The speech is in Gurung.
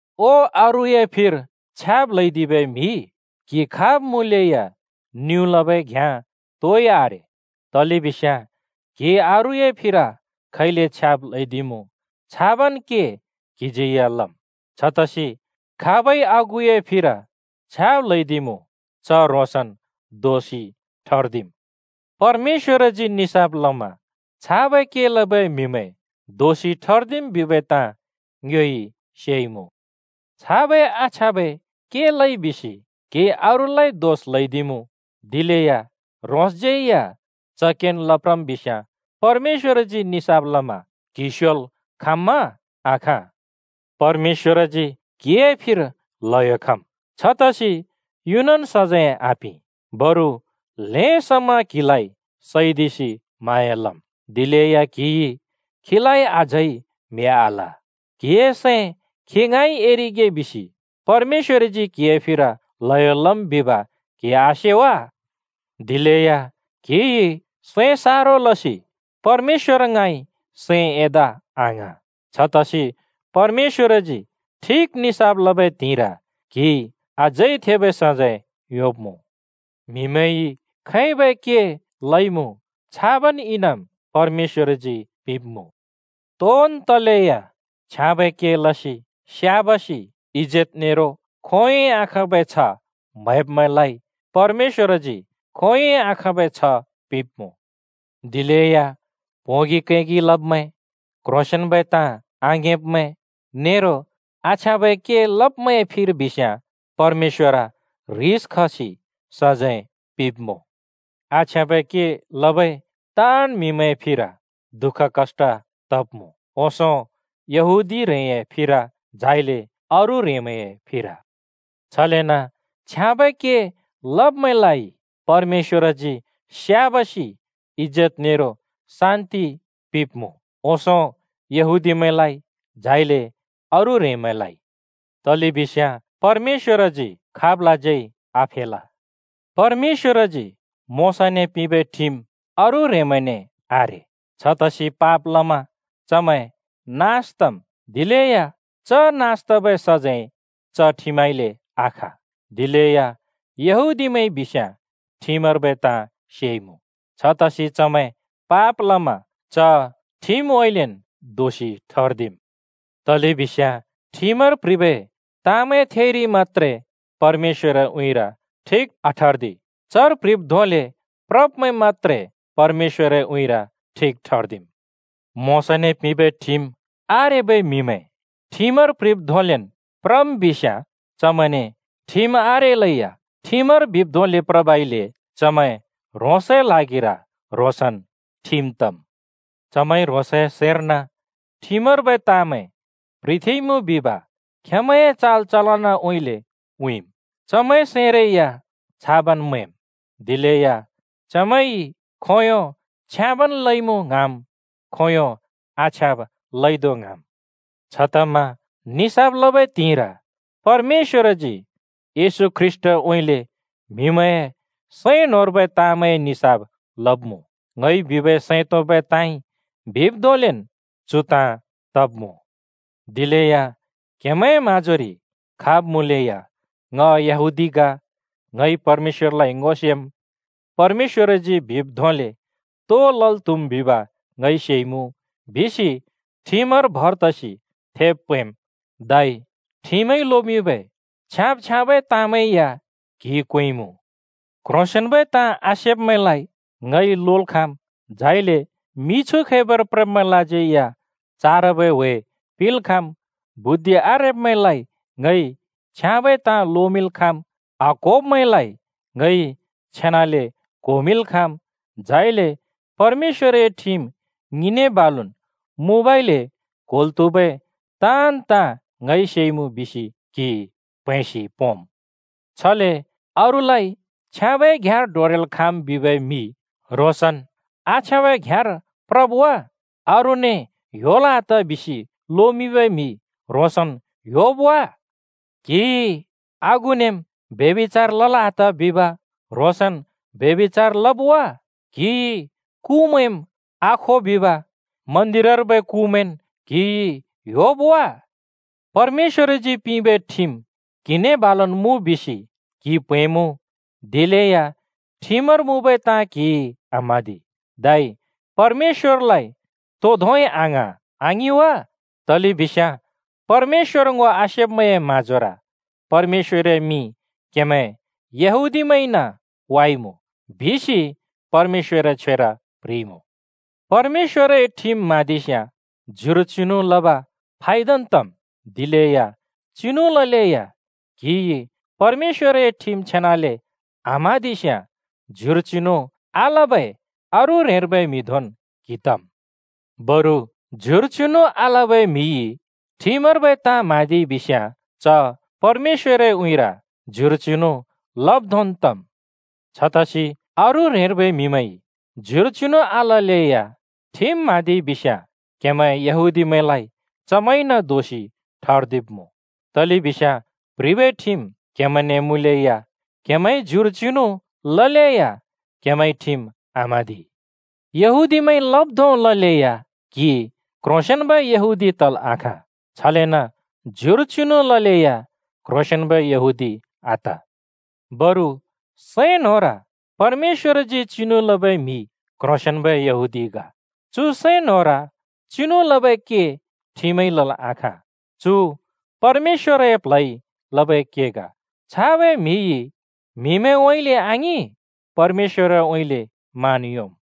ओ अरूए फिर छ्याब् ल्‍हैदिबै म्हि, क्‍हि खाब् मुँलेया निउँ लबै घ्याँ तोइ आरे, तलेबिस्याँ क्‍हिइ अरूए फिर खैले छ्याब् ल्‍हैदिमुँ छाबन् के क्हिज्यै लम्। छतसि खाबइ आगुए फिर छ्याब् ल्हैदिमुँ च ह्रोंसन् दोषि ठर्दिम्। परमेश्‍वरजी निसाफ लमा छाबै के लबै म्हिमैं दोषि ठर्दिम् बिबै ताँ ङ्योइ सेइमुँ। छाबै आछ्याँबै के लइ बिसि क्हिइ अरूलाइ दोष ल्हैदिमुँ, दिलेया ह्रोंसज्यै च केन् लप्रम् बिस्याँ परमेश्‍वरजी निसाफ लमा क्‍हि स्योल् खाँम्‍मा? आखाँ! परमेश्‍वरजी क्हिए फिर ल्हयो खम्, छतसि युनन् सजैं आपिं, बरु ल्हें समा क्हिलाइ सैदिसि म्हाँया लम्। दिलेया क्‍हिइ खीलाइ अझै म्‍हि आल! क्‍हिए सैं खी ङाँइ एरिगे बिसि परमेश्‍वरजी क्हिए फिर ल्हयो लम् बिब क्‍हिइ आसे वा? दिलेया क्‍हिइ सैं सारो लसि परमेश्‍वर ङाँइ सैं एदा आङ्हाँ। छतसि परमेश्‍वरजी ठिक निसाफ लबै त्हिंइर क्‍हिइ अझै थेबै सजैं योंब्‍मुँ। म्‍हिमैंइ खैबै के लइमुँ छाबन् इनाम परमेश्‍वरजी पिंब्‍मुँ। तोन् तलेया छ्याँबै के लसि स्‍याबासि, इजेत नेरो खोंयोंइ आखाँबै छ्ह म्‍हैब्मैंलाइ परमेश्‍वरजी खोंयोंइ आखाँबै छ्ह पिंब्‍मुँ। दिलेया प्होंगि कैगि लब्मैं, क्ह्रोंसेंन्बै ताँ आङिंब्मैं नेरो आछ्याँबै के लब्मैंए फिर बिस्याँ परमेश्‍वर ह्रिस खसि सजैं पिंब्‍मुँ। आछ्याँबै के लबै ताँन् म्‍हिमैंए फिर दुःख कष्‍ट तब्‍मुँ, ओंसों यहूदी ह्रेंए फिर झाइले अरू ह्रेंमैंए फिर। छलेन छ्याँबै के लब्‍मैंलाइ परमेश्‍वरजी स्‍याबासि, इजेत नेरो शान्‍ति पिंब्‍मुँ, ओंसों यहूदीमैंलाइ झाइले अरू ह्रेंमैंलाइ। तलेबिस्याँ परमेश्‍वरजी खाबलाज्यै आफेल। परमेश्‍वरजी मोशाने पिंबै ठिम अरू ह्रेंमैंने आरे। छतसि पाप लमा चमैं नास तम्, दिलेया च नास तबै सजैं च ठिमउँइँले आख। दिलेया यहूदीमैंइ बिस्याँ ठिमर्बै ताँ सेइमुँ। छतसि चमैं पाप लमा च ठिमउँइँलेन् दोषि ठर्दिम्। तलेबिस्याँ ठिमर प्ह्रिबै ताँमैं थेइरि मत्‍त्रे परमेश्‍वरए उँइँरि ठिक आठर्दि, चर प्ह्रिब् धोंले प्रब्मैं मत्‍त्रे परमेश्‍वरए उँइँर ठिक ठर्दिम्। मोशाने पिंबै ठिम आरेबै म्‍हिमैं ठिमर प्ह्रिब् धोंलेन् प्रम् बिस्याँ चमैंने ठिम आरेलैया ठिमर बिब् धोंले प्रबइले चमैं ह्रोंसए ल्हागिर ह्रोंसन् ठिम तम्। चमैंइ ह्रोंसए सैंर्न ठिमर्बै ताँमैं प्‍ह्रिथेंइमुँ बिब खेंमैंए चाल चलनउँइँले उँइँम्। चमैंए सैंरै या छाबन् मैंम्, दिलेया चमैंइ खोंयों छ्याँबन् लइमुँ ङ्हाँम्, खोंयों आछ्याँब लइदो ङ्हाँम्। छतमा निसाफ लबै त्हिंइर परमेश्‍वरजी येशू ख्रीष्‍टउँइँले म्‍हिमैंए सैं न्‍होंर्बै ताँमैंए निसाफ लब्‍मुँ। ङइ बिबै सैं तोंबै ताँइ बिब् धोंलेन् चु ताँ तब्मुँ। दिलेया क्‍हेमैंए म्‍हाँजोरि खाब् मुँलेया “ङ यहूदी ग, ङइ परमेश्‍वरलाइ ङो सेम्, परमेश्‍वरजी बिब् धोंले तो लल् त्‍हुम् बिब ङइ सेइमुँ,” बिसि ठिमर भर तसि थेब् प्हैंम्। धै ठिमइ लोमिंबै छ्याँब-छ्याँबै ताँमैं या क्हिइ क्वेंइमुँ। “क्‍ह्रोंसेंन्बै ताँ आसेब्मैंलाइ ङइ लोल् खाँम्, झाइले मिछु खैबर प्रब्मैंलाज्यै चारबै ह्‍वे पिंल् खाँम्, बुद्धि आरेब्‍मैंलाइ ङइ छ्याँबै ताँ लोमिंल् खाँम्, आक्होब्‍मैंलाइ ङइ छेनाले क्होमिंल् खाँम्। झाइले परमेश्‍वरए ठिम ङिने बालुन् मुँबइले क्होल् त्‍हुबै ताँन् ताँ ङइ सेइमुँ,” बिसि क्हि प्हैंसि पोंम्। छले अरूलाइ छ्याँबै घ्याँर डोरेल् खाँम् बिबै म्हि ह्रोंसन् आछ्याँबै घ्याँर प्रब् वा? अरूने “ह्‍योल् आत” बिसि लोमिंबै म्हि ह्रोंसन् ह्‍योब् आ? क्‍हिइ आगुनेम् “ब्यभिचार लल् आत!” बिब ह्रोंसन् ब्यभिचार लब् वा? क्‍हिइ कुमैंम् आखो बिब मन्‍दिरर्बै कुमैंन् ह्‍योब् आ? परमेश्‍वरजी पिंबै ठिम क्‍हिने बालु मुँ बिसि क्‍हि प्‍हैंमुँ, दिलेया ठिमर मुँबै ताँ क्‍हिइ आम्हाँदि, धै परमेश्‍वरलाइ तो धोंइ आङ्हाँ, आङिं वा? तलेबिस्याँ परमेश्‍वर ङो आसेब्मैंए म्हाँजोर परमेश्‍वरए मिं क्हेमैं यहूदीमैंइन वाइमुँ, बिसि परमेश्‍वरए छ्वेर प्ह्रिइमुँ। परमेश्‍वरए ठिम म्हाँदिस्याँ ज्युर चिनु लब फायदन् तम्। दिलेया चिनु ललेया क्‍हिइ परमेश्‍वरए ठिम छेनाले आम्हाँदिस्‍याँ ज्युर चिनु आलबै अरू ह्रेंर्बै म्‍हि धोंन् क्‍हि तम्। बरु ज्युर चिनु आलबै म्‍हिइ ठिमर्बै ताँ म्हाँदिइ बिस्‍याँ च परमेश्‍वरए उँइँर ज्युर चिनु लब् धोंन् तम्। छतसि अरू ह्रेंर्बै म्‍हिमैंइ ज्युर चिनु आललेया ठिम म्हाँदिइ बिस्याँ, क्हेमैं यहूदीमैंलाइ चमैंइन दोषि ठर्दिब्मुँ। तलेबिस्याँ प्ह्रिबै ठिम क्हेमैंने मुँलेया, क्हेमैंइ ज्युर चिनु ललेया क्हेमैंइ ठिम आम्हाँदि। यहूदीमैंइ लब् धों ललेया क्हि क्ह्रोंसेंन्बै यहूदी तल् आखाँ। छलेन ज्युर चिनु ललेया क्ह्रोंसेंन्बै यहूदी आत। बरु सैं न्‍होंर परमेश्‍वरजी चिनु लबै म्‍हि क्‍ह्रोंसेंन्‍बै यहूदी ग। चु सैं न्‍होंर चिनु लबै के ठिमइ लल् आखाँ, चु परमेश्‍वरए प्ल्हइ लबै के ग। छाबै म्‍हिइ म्‍हिमैंउँइँले आङिं, परमेश्‍वरउँइँले मान योंम्।